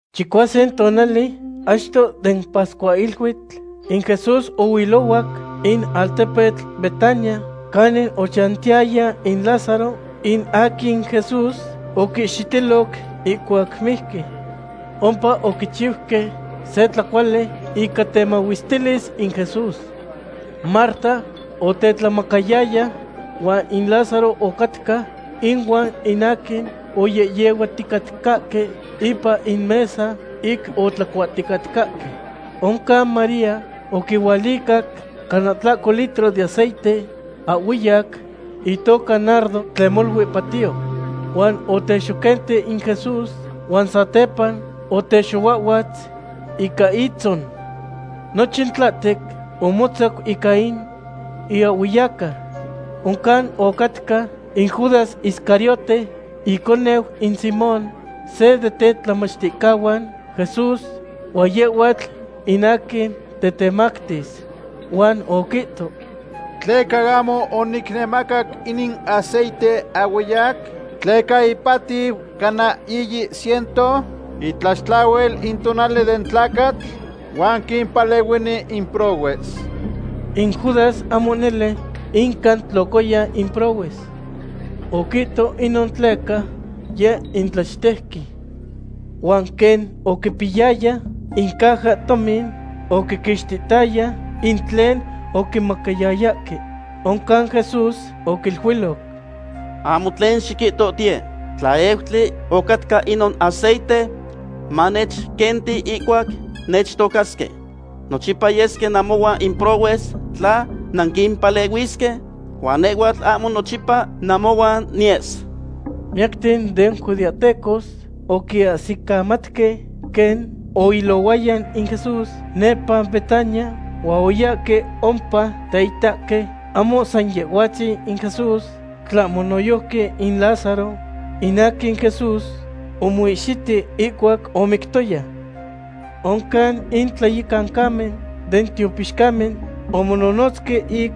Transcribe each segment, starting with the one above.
Chicuasin tonali achto den pascuahiluitl, in Jesús ohuilohuac in altepetl Betania, canin ochantiyaya in Lázaro, in aquin Jesús oquihxitiloc ihcuac mijqui. Ompa oquichiuque se tlacuali ica temahuestilis in Jesús. Marta otetlahtlamacayaya, huan in Lázaro ocatca inuan in aquin oyehyehuaticatcahque ipan in mesa ic otlacuahticatcahque. Oncan María oquihualicac cana tlahco litro den aceite ahhueyac, itoca nardo, tlen molui patiyo. Huan otexoquenti in Jesús huan satepa otexohuahhuatz ica itzon. Nochin tlahtec omotzac ica in iahhueyaca. Oncan ocatca in Judas Iscariote, iconeu in Simón, se den tetlamachticahuan Jesús, huan yehhuatl in aquin tetemactis. Huan oquihto: ―¿Tleca ahmo oquinemacac inin aceite ahhueyac? Tleca ipatiu cana yiyi ciento itlaxtlahuil in tonali den tlacatl, huan quimpalehuini in prohues. In Judas ahmo nele inca tlocaya in prohues. Oquihto inon tleca yeh in tlachtejqui. Huan quen oquipiyaya in cajahtomin, oquiquixtihtaya in tlen oquimacayayahque. Oncan Jesús oquiluiloc: ―Ahmo tlen xiquihtohtiye. Tlaeutli ocatca inon aceite manechquenti ihcuac nechtocasque. Nochipa yesque namohuan in prohues tla nanquimpalehuisque, huan nehhuatl ahmo nochipa namohuan niyes. Miyacten den judeahtecos oquiahsicamatque quen oilohuaya in Jesús nepa Betania, huan oyahque ompa teitahque ahmo san Yehhuatzin in Jesús tlahmo noyojqui in Lázaro, in aquin Jesús omoihxiti ihcuac omictoya. Oncan in tlayecancamen den tiopixcamen omononotzque ic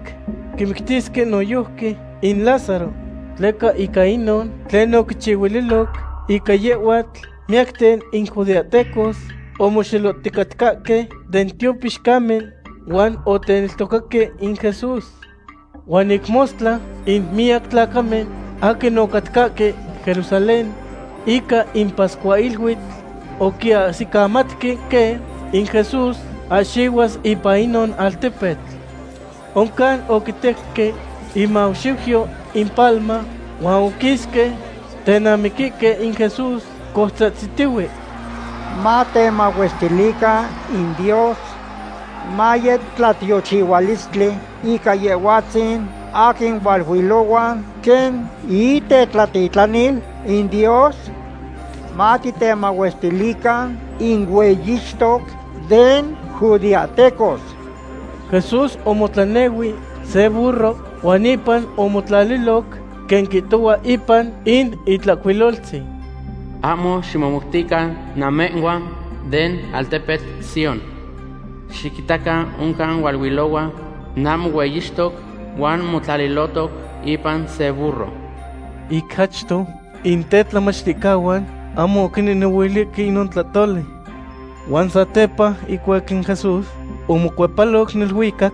quimictisque noyojqui in Lázaro. Tleca ica inon tlen oquichihuililoc ica yehhuatl, miyacten in judeahtecos omoxelohticatcahque den tiopixcamen huan oteneltocaque in Jesús. Huan ic mostla in miyac tlacamen aquin ocatcahque Jerusalén ica in pascuahiluitl oquiahsicamatque quen in Jesús ahxihuas ipan inon altepetl. Oncan oquitejque imaxiuyo in papalma huan oquisque tenamiquihque in Jesús, coutzahtzitihue: ―¡Matemahuestilican in Dios! ¡Maye tlatiochihuilistli ica Yehhuatzin aquin hualuilohua quen itetitlanil in Dios! ¡Matitemahuestilican in Hueyixtoc den judeahtecos! Jesús omotlanehui se burro huan ipan omotlaliloc, quen quihtohua ipan in Itlahcuiloltzin: Ahmo ximomoutican namehhuan den altepetl Sión. Xiquitacan oncan hualuilohua namohueyixtoc, huan motlalilotoc ipan se burro. Ic achto, in tetlamachticahuan ahmo oquinehnehuilihque inon tlahtoli. Huan satepa ihcuac in Jesús omocuepaloc neluicac,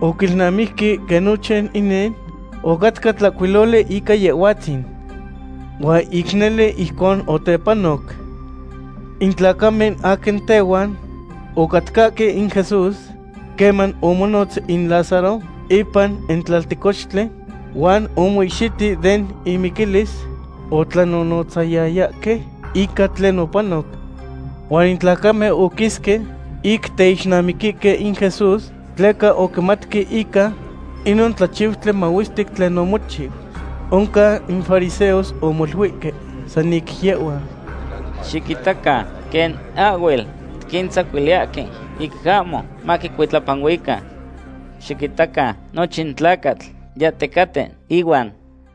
oquilnamijque quen nochin inin ocatca tlahcuiloli ica Yehhuatzin. Huan ic nele ijcon otepanoc. In tlacamen aquin tehuan ocatcahque in Jesús queman omonotz in Lázaro ipan in tlaltecohtli huan omoihxiti den imiquilis, otlanonotzayayahque ica tlen opanoc. Huan in tlacamen oquisque ic teixnamihque in Jesús, tleca oquimatque ica inon tlachiutli mahuestic tlen omochiu. Oncan in fariseos omoluihque san ic yehhuan: ―Xiquitacan quen ahhuel tiquintzacuiliyahque ic ahmo maquicuitlapanuican. Xiquitacan, nochin tlacatl yahticaten ihuan.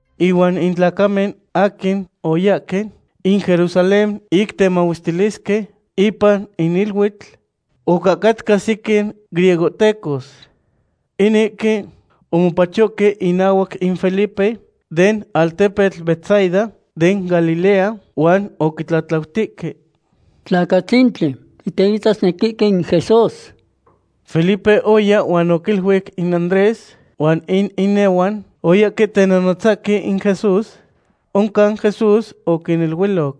Ihuan in tlacamen aquin oyahque in Jerusalén ic temahuestilisque ipan in iluitl, ocahcatca sequin griegohtecos. Inihque omopachohque inahuac in Felipe, den altepetl Betsaida den Galilea, huan oquitlatlautihque: ―Tlacatzintli, titeitasnequihque in Jesús. Felipe oya huan oquiluic in Andrés, huan in inehuan oyahque tenonotzahque in Jesús. Oncan Jesús oquiniluiloc: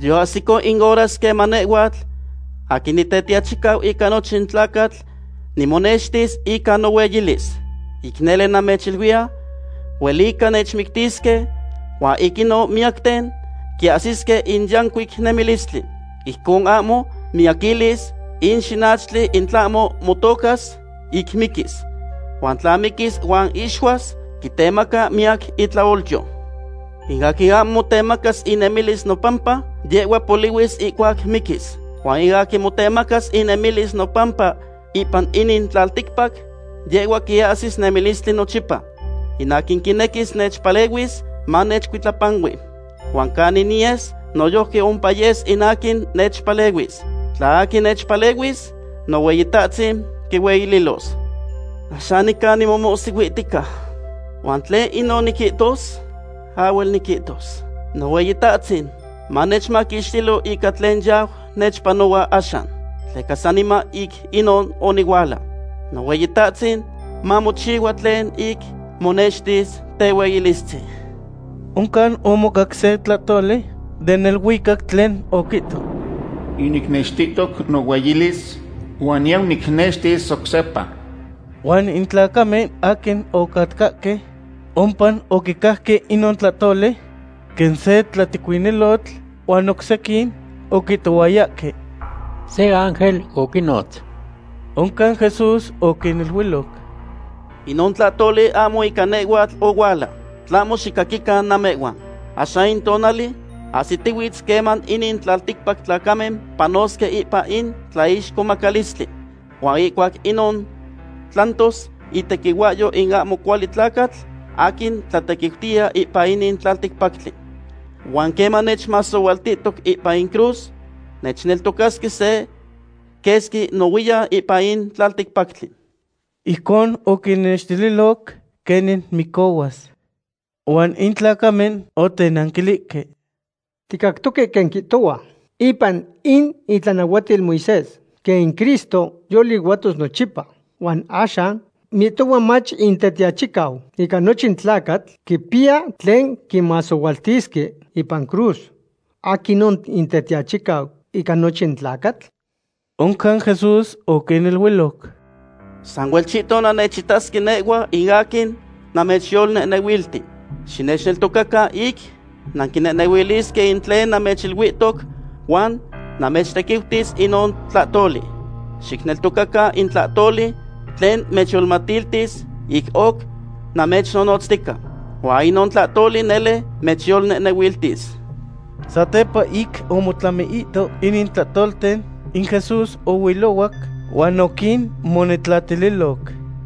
―Yoahsico in horas queman nehhuatl aquin Nitetiachicau ica nochin tlacatl nimonextis ica nohueyilis. Ic nele namechiluiya, huelica nechmictisque huan ic inon miyacten quiahsisque in yancuic nemilistli. Ijcon ahmo miyaquilis in xinachtli in tlahmo motocas, ic miquis. Huan tla miquis huan ixuas, quitemaca miyac itlaolyo. In aquin ahmo motemacas inemilis nopampa, yehhua polihuis ihcuac miquis. Huan in aquin motemacas inemilis nopampa ipan inin tlalticpac, yehhua quiahsis nemilistli nochipa. In aquin quinequis nechpalehuis, manechcuitlapanui. Huan canin niyes, noyojqui ompa yes in aquin nechpalehuis. Tla aquin nechpalehuis, Nohueyitahtzin quihueyililos. ’Axan nica tequin nimomohsihuihtica; ¿huan tlen inon niquihtos? Ahhuel niquitos: “Nohueyitahtzin, manechmaquixtilo ica tlen yau nechpanohua axan.” Tleca saniman ic inon onihuala. Nohueyitahtzin, mamochihua tlen ic monextis tehueyilistzin. Oncan omocac se tlahtoli den neluicac tlen oquihto: ―Yinicnextihtoc nohueyilis, huan niyau nicnextis oc sepa. Huan in tlacamen aquin ocatcahque ompa oquicajque inon tlahtoli quen se tlatecuinilotl, huan oc sequin oquihtohuayahque: ―Se ángel oquinotz. Oncan Jesús oquiniluiloc: ―Inon tlahtoli ahmo ica nehhuatl ohuala, tlahmo xicaquican namehhuan. Axan in tonali ahsitihuitz queman inin tlalticpac tlacamen panosque ipan in tlaixcomacalistli, huan ihcuac inon tlantos itequihuahyo in ahmo cuali tlacatl aquin tlatequiutiya ipan inin tlalticpactli. Huan queman nechmasohualtihtoc ipan in cruz, nechneltocasque se quesqui nohuiyan ipan in tlalticpactli. Ijcon oquinnextililoc quenin micohuas. Huan in tlacamen otenanquilihque: ―Ticactoque quen quihtohua ipan in itlanahuatil Moisés quen in Cristo yolihuatos nochipa. Huan axan, mihtohua mach in Tetiachicau ica nochin tlacatl quipiya tlen quimasohualtisque ipan cruz. ¿Aquinon in Tetiachicau ica nochin tlacatl? Oncan Jesús oquiniluiloc: ―Sahuelchihton nannechitasque nehhua in aquin namechyolnehnehuilti. Xinechneltocacan ic nanquinehnehuilisque in tlen namechiluihtoc huan mamechtequiutis inon tlahtoli. Xicneltocacan in tlahtoli tlen mechyolmatiltis ic oc namechnonotztica. Huan inon tlahtoli nele mechyolnehnehuiltis. Satepa ic omotlamiihto inin tlahtolten, in Jesús ohuilohuac huan oquinmonetlatililoc.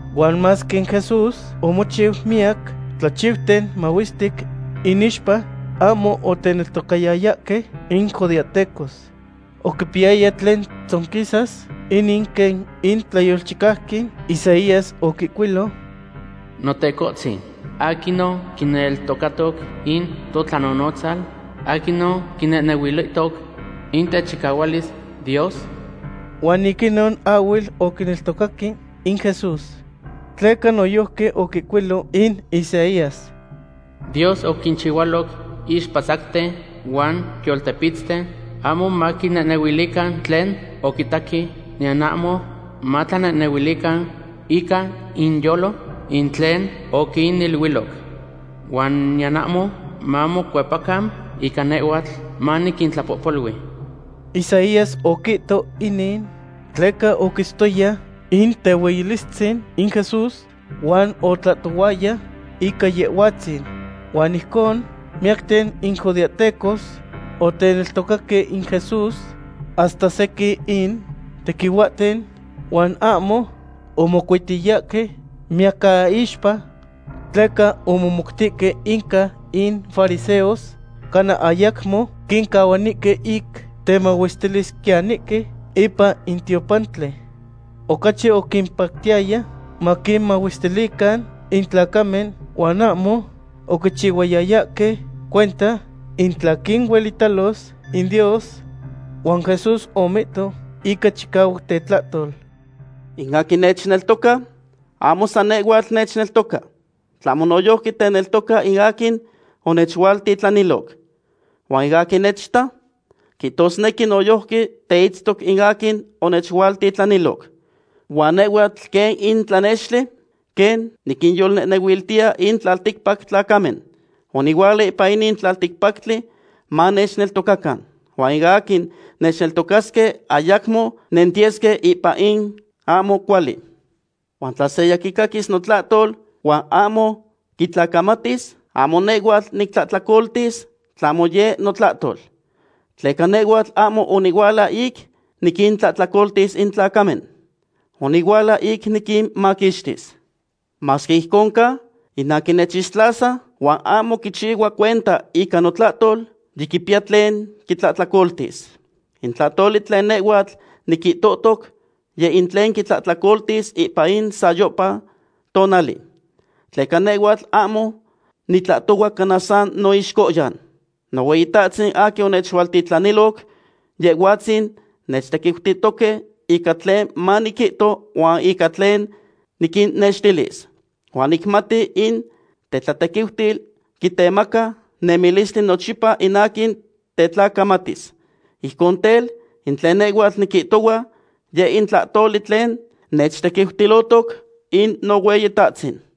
Huan masque in Jesús omochiu miyac tlachiuten mahuestic inixpa, ahmo oteneltocayayahque in judeahtecos. Oquipiyaya tlen tzonquisas inin quen in tlayolchicauqui Isaías oquihcuilo: Notecohtzin, ¿aquinon quineltocatoc in totlanonotzal? ¿Aquinon quinehnehuilihtoc in techicahualis Dios? Huan ic inon ahhuel oquineltocaque in Jesús. Tleca noyojqui oquihcuilo in Isaías: Dios oquinchihualoc ixpatzacten huan yoltepitzten, ahmo maquinehnehuilican tlen oquitaque, niyan ahmo matlanehnehuilican ica inyolo in tlen oquiniluiloc. Huan niyan ahmo mamocuepacan ica nehhuatl maniquintlapohpolui. Isaías oquihto inin tleca oquitztoya in tehueyilistzin in Jesús, huan otlahtohuaya ica Yehhuatzin. Huan ijcon, miyacten in judeahtecos oteneltocaque in Jesús, hasta sequin in tequihuahten, huan ahmo omocuitiyahque miyacaixpa tleca omomoutihque inca in fariseos, cana ayacmo quincahuanihque ic temahuestilisquiyanihque ipan in tiopantli. Ocachi oquimpactiyaya maquinmahuestilican in tlacamen huan ahmo oquichihuayayahque cuenta in tla quinuelitalos in Dios. Huan Jesús omihto ica chicahuac tetlahtol: ―In aquin nechneltoca, ahmo san nehhuatl nechneltoca, tlahmo noyojqui teneltoca in aquin onechualtitlaniloc. Huan in aquin nechita, quihtosnequi noyojqui teitztoc in aquin onechualtitlaniloc. Huan nehhuatl quen in tlanextli quen niquinyolnehnehuiltiya in tlalticpac tlacamen. Onihuala ipan inin tlalticpactli manechneltocacan. Huan in aquin nechneltocasque ayacmo nentiyesque ipan in ahmo cuali. Huan in tla seya quicaquis notlahtol huan ahmo quitlacamatis, ahmo nehhuatl nictlahtlacoltis, tlahmo yeh notlahtol. Tleca nehhuatl ahmo onihuala ic niquintlahtlacoltis in tlacamen. Onihuala ic niquinmaquixtis. Masque ijcon ca, in aquin nechixtlasa, huan ahmo quichihua cuenta ica notlahtol, yiquipiya tlen quitlahtlacoltis. In tlahtoli tlen nehhuatl niquihtohtoc, yeh in tlen quitlahtlacoltis ipan in sayohpa tonali. Tleca nehhuatl ahmo nitlahtohua cana san noixcohyan. Nohueyitahtzin aquin onechualtitlaniloc, Yehhuatzin nechtequiutihtoque ica tlen maniquihto huan ica tlen niquinnextilis. Huan nicmati in tetlatequiutil quitemaca nemilistli nochipa in aquin tetlacamatis. Ijcon tel, in tlen nehhuatl niquihtohua, yeh in tlahtoli tlen nechtequiutilohtoc in Nohueyitahtzin.